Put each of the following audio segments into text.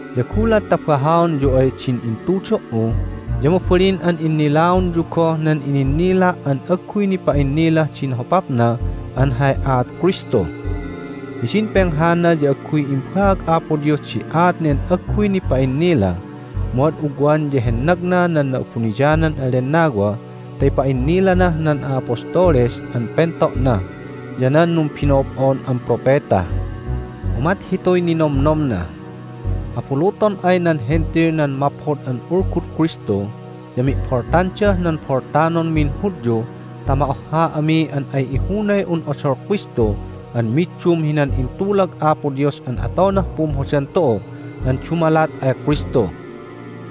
ya gulat ta bahaonyu ay din intudo"u ya mabalin an innilaonyu goh nan ininnila' an agguy nipa'innilah din hopapna an hay aat Kristu. Hidin penghana ya agguy imbaag Apo Dios di aat nen agguy nipa'innila, mu ad ugwan ya hennagna nan Na'abuniyanan an Lennawa ta ipa'innilanah nan a'apostoles an pento'na ya nan numbino'ob'on an propeta. Umat hituy ninomnomna: Abuluton ay nan Hentil nan Maphod an Ulgud Kristu ya mi'boltandah nan boltanonmin Hudyu ta ma'ohha ami an ay ihunay un odol Kristu an middum hinan intulag Apo Dios an atonah pumhodan tu'u an dumalat ay Kristu.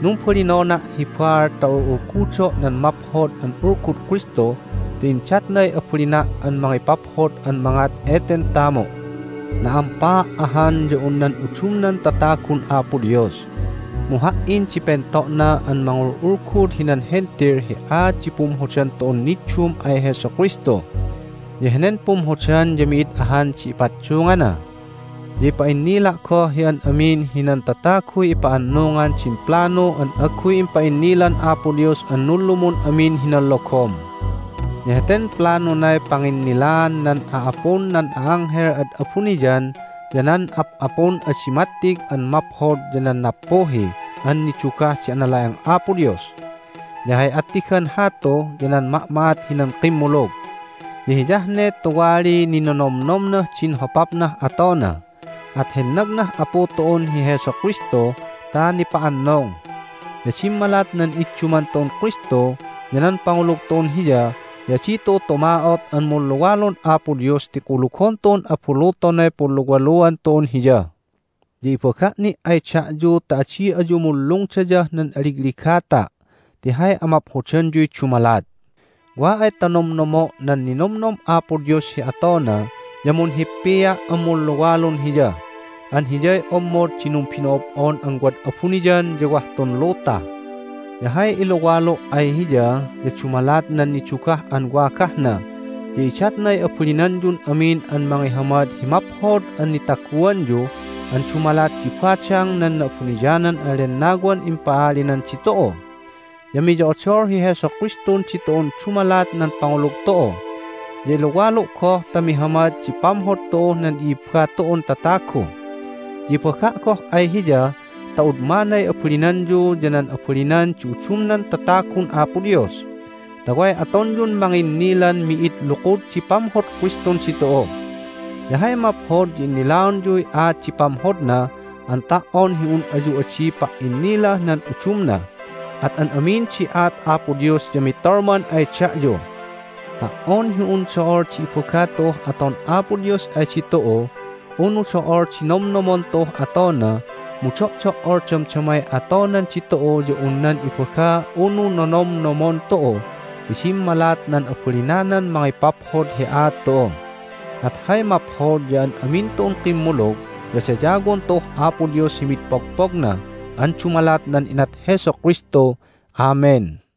Numbalinona' hi baal ta ul'ulgudo' nan Maphod an Ulgud Kristu ti indatnay abalina' an mangipaphod an mangat eten tamu'. Na'ampaa' ahan ya un nan udumnan tatagun Apo Dios, mu ha"in di pento'na an mangul'ulgud hinan Hentil hi aat di pumhodan tu'un niddum ay Jesu Kristu. Ya henen pumhodan ya mi'id ahan di ipaddungana. Ya ipa'innila' goh hi an amin hinan tataguy ipa'annungan din planu an agguy impa'innilan Apo Dios an nunlumun amin hinan logom. Ya heten planunay panginnilaan nan a'apun nan a'anghel ad abuniyan ya nan ap'apun adi mattig an maphod ya nan nappuhi an nidugah di anala'eng Apo Dios. Ya hay attigan hatu ya nan ma'ma'at hinan kimmulug. Ya hiyah ne tuwaliy ninonomnomnah din hopapnah atona, at hennagnah Apu tu'un hi Jesu Kristu ta nipa'annung. Ya dimmalat nan idduman tu'un Kristu ya nan pangulug tu'un Hiya ya adi tu'u tuma'ot an munluwalun Apo Dios ti kulugon tu'un abulutonay punluwaluan tu'un Hiya. Ya ibaga' ni' ay da'yu ta adi ayu munlungdayah nan aligligata' ti hay amaphodanyuy dumalat. Wa ay ta nomnomo' nan ninomnom Apo Dios hi atona ya munhippia' an munluwalun Hiya an Hiyay ommod di numbino'ob'on an wad abuniyan ya wah tun luta. Ya hay iluwalu' ay Hiya ya dumalat nan nidugah an wagahna ya idatnay abalinanyun amin an mangihamad hi maphod an nitaguanyu an dumalat di badang nan Na'abuniyanan an Lennawan impa'alinan ditu'u. Ya miyo'odol hi Jesu Kristun ditu'un dumalat nan pangulug tu'u, ya iluwalu' goh ta mihamad di pamhod tu'uh nan i'ibba tu'un tatagu. Ya ibaga' goh ay Hiya ta udmanay abalinanyu ya nan abalinan di udumnan tatagun Apo Dios, ta way atonyun manginnilan mi'id lukud di pamhod Kristun ditu'u. Ya hay maphod ya innilaonyuy aat di pamhodna an ta"on hi un ayu adi pa"innilah nan udumna, at an amin di aat Apo Dios ya mitolman ay da'yu. Ta"on hi un do'ol di ibaga tu'uh aton Apo Dios ay ditu'u unu do'ol di nomnomon tu'uh atona mu do'do"ol damdamay atonan ditu'u ya un nan ibaga unu nomnomnomon tu'u ti dimmalat nan abalinanan mangipaphod hi aat tu'u. At hay maphod ya an amin tu'un kimmulug ya dayawon tu'uh Apo Dios hi mid pogpogna an dumalat nan inat Jesu Kristu! Amen!